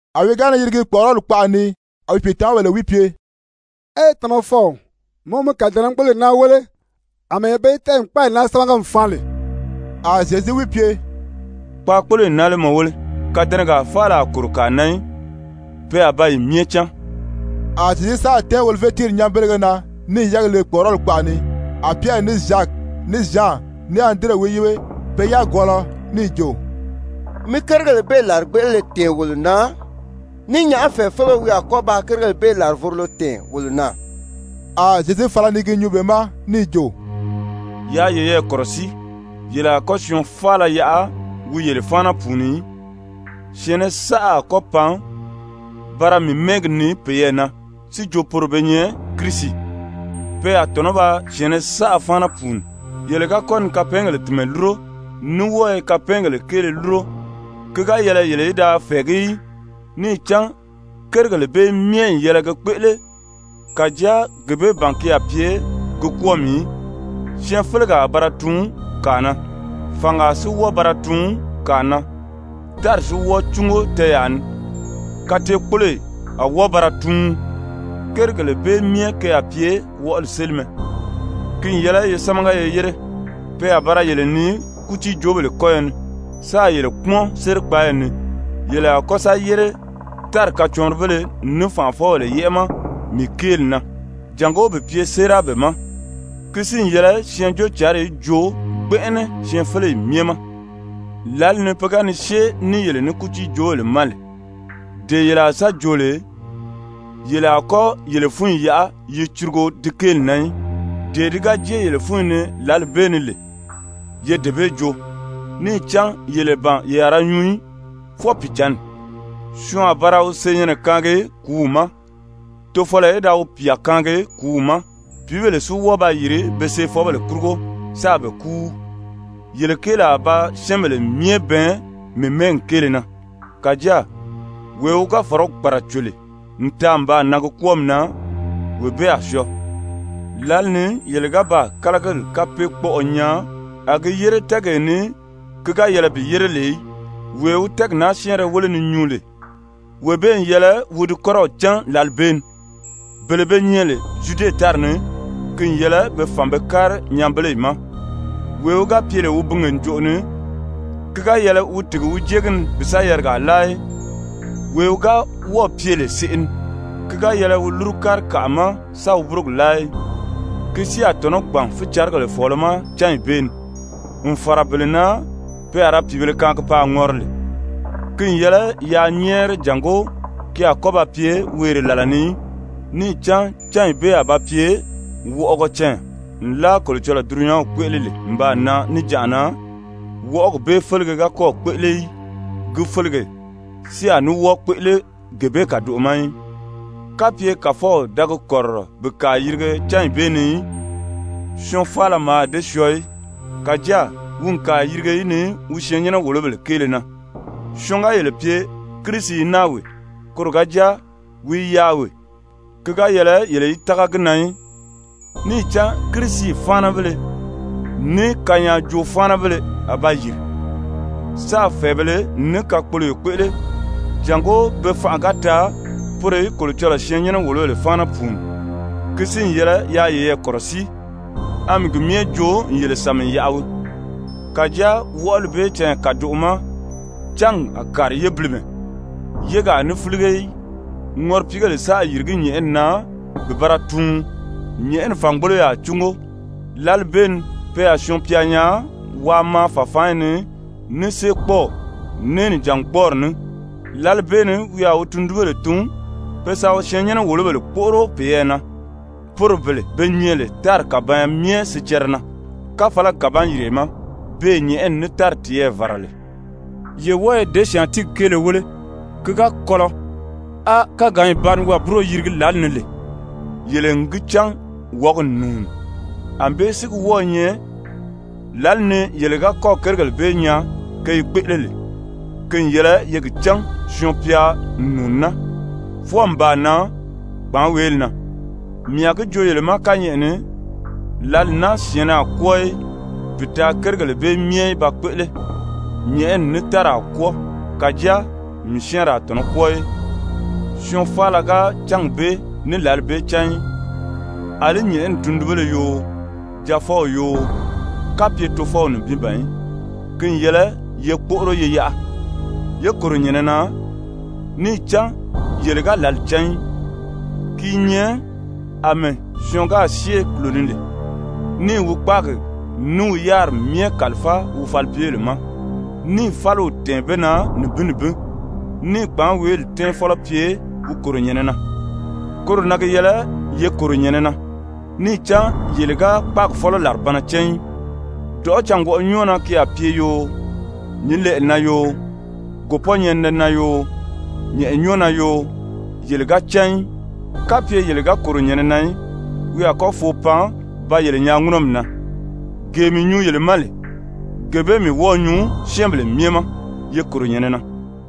A wi ga ni yirigi kpɔ̀ʔɔrɔli kpaʔa ni, a wi pìitamawaa wi pye: «Ee, Tamafɔw, mɔ mi kàdɛnɛgboloyi naa wéle àmɛɛ be yi tɛ́ʔɛ n kpáayi naa sámaga n faan lè.» A Zyezu wi pye: «Kpaakpoloyi naa lé mɔ wéle? Kàdɛnɛgaa faala a kòro kàa na í, pe a ba yi myɛ cáan.» A Zyezu sáà tɛ́ɛn Olivye tíiri nyanbelege na, níì yɛ́ɛgi le kpɔ̀ʔɔrɔli kpaʔa ni, a Pyɛri, ní Zyaki, ní Zyan, ní Andire wi yíbe, pe yagwɔɔlɔ, níì jo: «Mi kérigèle bee làrigbeʔelele tɛ̀ɛn wolo na, ní nyàʔá fɛ̀ɛfeleo wi a kɔ́ ba kérigèle bee làrivorolo tɛ̀ɛn wolo na?» A Zyezu fala ni gi nyuu be ma níì jo: «Yaa yeyɛɛ kɔ̀rɔsíi, yele a kɔ́ syɔɔn faala yaʔa wi yele fáana pùuni í. Syɛ̀ɛnnɛ saʔa a kɔ́ pan ba ra mii mɛ́ɛgi nii peyɛɛ na si jo poro be nyɛ Kirisi. Pe a tɔ̀nɔ́ ba syɛ̀ɛnnɛ saʔa fáana pùuni. Yele ga kɔ́ ni kapɛɛngèle tìnmɛ lúro, ní wɔ́ɔ i kapɛɛngèle kéele lúro, ki ga yɛlɛ yele í da fɛ̀ɛgí í, níì cán kérigèle bee myɛ n yɛlɛ ge kpéʔele. Kàjáa gee bee ban ki a pye gi kwɔ́ɔmi í. Syɛɛnfelegaa a ba ra tuun kàa na, fàngaa si wɔ́ɔ ba ra tuun kàa na. Tári si wɔ́ɔ cúngo tɛɛyaa ni. Kateekpoloyi a wɔ́ɔ ba ra tuun. Kérigèle bee myɛ ke a pye wɔʔɔli sélimɛ. Ki n yɛlɛ ye sámaga ye yére. Pe a ba ra yele nii kútiijoobèle kɔ́yɔ ni, sáā yele kpúmɔn sérikpaayi ni. Yele a kɔ́ sa yére tári kacɔɔnribéle ní fànʔafɔbèle yɛ́ʔɛ ma mii kéeli na, jàngó bi pye séera be ma. Ki si n yɛlɛ Syɛɛnjóocǎnri í joo gbɛnʔɛnɛ syɛɛnfeleyi myɛ ma. Lǎli ni pe ga ni syée ní yele ní kútiijoobèle ma lè, dee yele a sa joo lè, yele a kɔ́ yele fúnyi yaʔa yi curugo di kéeli na í, dee di ga jée yele fúnyi ni lǎli bee ni lè, ye dee bee joo. Níì cán yele ban ye a ra nyuu í, fwɔɔ Pìicǎnni. Syɔɔn a ba ra wi senyɛnnɛ kaangi kùúw ma, tofɔlɔ í da wi pyà kaangi kùúw ma. Pìíbèle si wɔ́ɔ ba yìri be seefɔbèle kurugo sáā be kúu. Yele kéeli a ba syɛ́ɛnbèle myɛ bɛɛn mii mɛ́ɛgi kéele na. Kàjáa wee wi ga fɔ̀rɔgi kpàraco lè n taa n baa nan gi kwɔ́ɔmi na, wee bee a syɔɔ. «Lǎli ni yele ga baa ‹kálagili kapeekpɔʔɔ› nyaa a gi yére tɛ́ɛgee ni ki ga yɛlɛ bi yére lè í, (wee wi tɛ́ɛgi naa syɛ́ɛnrɛ wéle ni nyuu lè, wee bee n yɛlɛ wi di kɔ́rɔw cán) lǎli bee ni, bele be nyɛ lè Zyude tári ni, ki n yɛlɛ be fàn be kári nyanbeleyi ma. Wee wi ga pye lè wi binge ǹjoʔo ni, ki ga yɛlɛ wi tìgi bi jée gi ni bi sa yarigaa láa í. Wee wi ga wɔ́ɔ̀ pye lè seʔe ni, ki ga yɛlɛ wi lúru kári kàʔa ma sa wi búrogi láa í. Ki si a tɔ̀nɔ́ gbàn fícarigèle fɔ̀ɔlɔ ma cányi bee ni, n fàra bele na pe a ra pìibēle kaangi paa ŋɔri lè. Ki n yɛlɛ yaa nyɛ́ɛri jàngó ki a kɔ́ ba pye weere làla ni í. Níì cán cányi bee a ba pye wɔʔɔgɔ canya, nlaa Kolocɔlɔɔ dulunyanw kpéʔele lè n baa nan níjanʔa na, wɔʔɔgi bee félege ga kɔ́ɔ̀ kpéʔele í, gi félegi si a ní wɔ́ɔ kpéʔele gee bee kàdoʔo ma í. Kapye Kàfɔw da gi kɔ̀rirɔ bi kàa yirige cányi bee ni í, syɔɔn faala mǎà dée syɔɔ í. Kàjáa wi n kàa yirige yi ni wi syɛɛnnyɛnɛ-wòlobèle kéele na. Syɔɔn ga yele pye: ‹Kirisi i naa wee,› koro ga jáa: ‹Wi i yaà wee,› ki ga yɛlɛ yele í tága gi na í. Níì cán kirisi-fáanabéle, ní kanyaajoo-fáanabéle a ba yìri, sáā fɛ̀ɛbēle ní kakpoloyo kpéʔele, jàngó be fanʔa ga taa poro í Kolocɔlɔɔ syɛɛnnyɛnɛ-wòlobèle fáana pùuni. Ki si n yɛlɛ yaa yeyɛɛ kɔ̀rɔsíi, a mii gi myɛ joo n yele sàmi n yaʔa wii. «Kàjáa wɔʔɔli bee canya kàdoʔo ma ‹cángi a kàri yébilimɛ, yégi a ní fílige í. Ŋɔripiigèle sáā yìrigí nyɛ̀ʔɛni na bi ba ra tuun, nyɛ̀ʔɛni fàngboloyo a cúngo.› Lǎli bee ni pe a Syɔɔn-pya nyaa waa maa fàfaanyi ni ní séekpɔɔw, ní nìjangbɔɔri ní. Lǎli bee ni wi a wi tundunbèle tun be sa wi syɛɛnnyɛnɛ-wòlobèle kpóʔoro peyɛɛ na, poro bele be nyɛ lè tári kàbanya myɛ sicɛrɛ na káfalagi kàban-yìriye ma, beè nyɛ̀ʔɛni ní tári tiyɛɛ vàra lè. «Ye wɔ́ɔ ye děsyaantiigi kéele wéle, ki ga kɔlɔ, á káganyi ba ni wâburo yirigi lǎli ni lè, yele n gi cán wɔ̀ɔ́gi n nùuni. Anbée si gi wɔ́ɔ i nyɛ, lǎli ni yele ga kɔ́ɔ̀ kérigèle bee nyaa ke i kpéʔele lè, ki n yɛlɛ ye gi cán Syɔɔn-pya n nùuni naa, fwɔɔ n baa nan kpàánweeli na. Mii a gi joo yele ma kányɛʔɛ ni, lǎli naa syɛ̀ɛnnɛ a kwɔ́ɔ í bi taa kérigèle bee myɛ í ba kpéʔele. Nyɛ̀ʔɛni ní tári a kwɔ́ɔ, kàjáa mii syɛ́ɛnri a tɔ̀nɔ́ kwɔ́ɔ í. «Syɔɔn faala ga cángi bee ní lǎli bee cán í, àlí nyɛ̀ʔɛni tundunbéle yoo, Jaafɔw yoo, kapye Tofɔw nibin ban í. Ki n yɛlɛ ye kpóʔoro ye yaʔa, yé kòro nyɛ̀nɛ na, níì cán yele ga lǎli cán í. Ki i nyɛ àmɛɛ syɔɔn gáā syée kùlo ni lè, níì wi kpáagi ní wi yáriri myɛ kàlifáa wi falipyebèle ma, níì fáliw tɛ̀ɛn be na nibin nibin, níì kpàánweeli tɛ́ɛnfɔlɔ pye wi kòro nyɛ̀nɛ na. Koro na gi yɛlɛ ye kòro nyɛ̀nɛ na, níì cán yele ga kpáagi fɔ́lɔ làribanna cán í, dɔ̀ʔɔ́ cângwɔʔɔ nyɔ́ɔ na ki a pye yoo, nyǐnlɛʔɛ na yoo, gòpɔ́nyɛninɛ na yoo, nyɛ̀ʔɛ nyɔ́ɔ na yoo, yele ga cán í. Kapye yele ga kòro nyɛ̀nɛ na í, wi a kɔ́ foo pan ba yele nyaa ŋúnɔmi na. Gee mii nyuu yele ma lè, gee bee mii wɔ́ɔ̄ nyuu syɛ́ɛnbèle myɛ ma: ‹Ye kòro nyɛ̀nɛ na.›»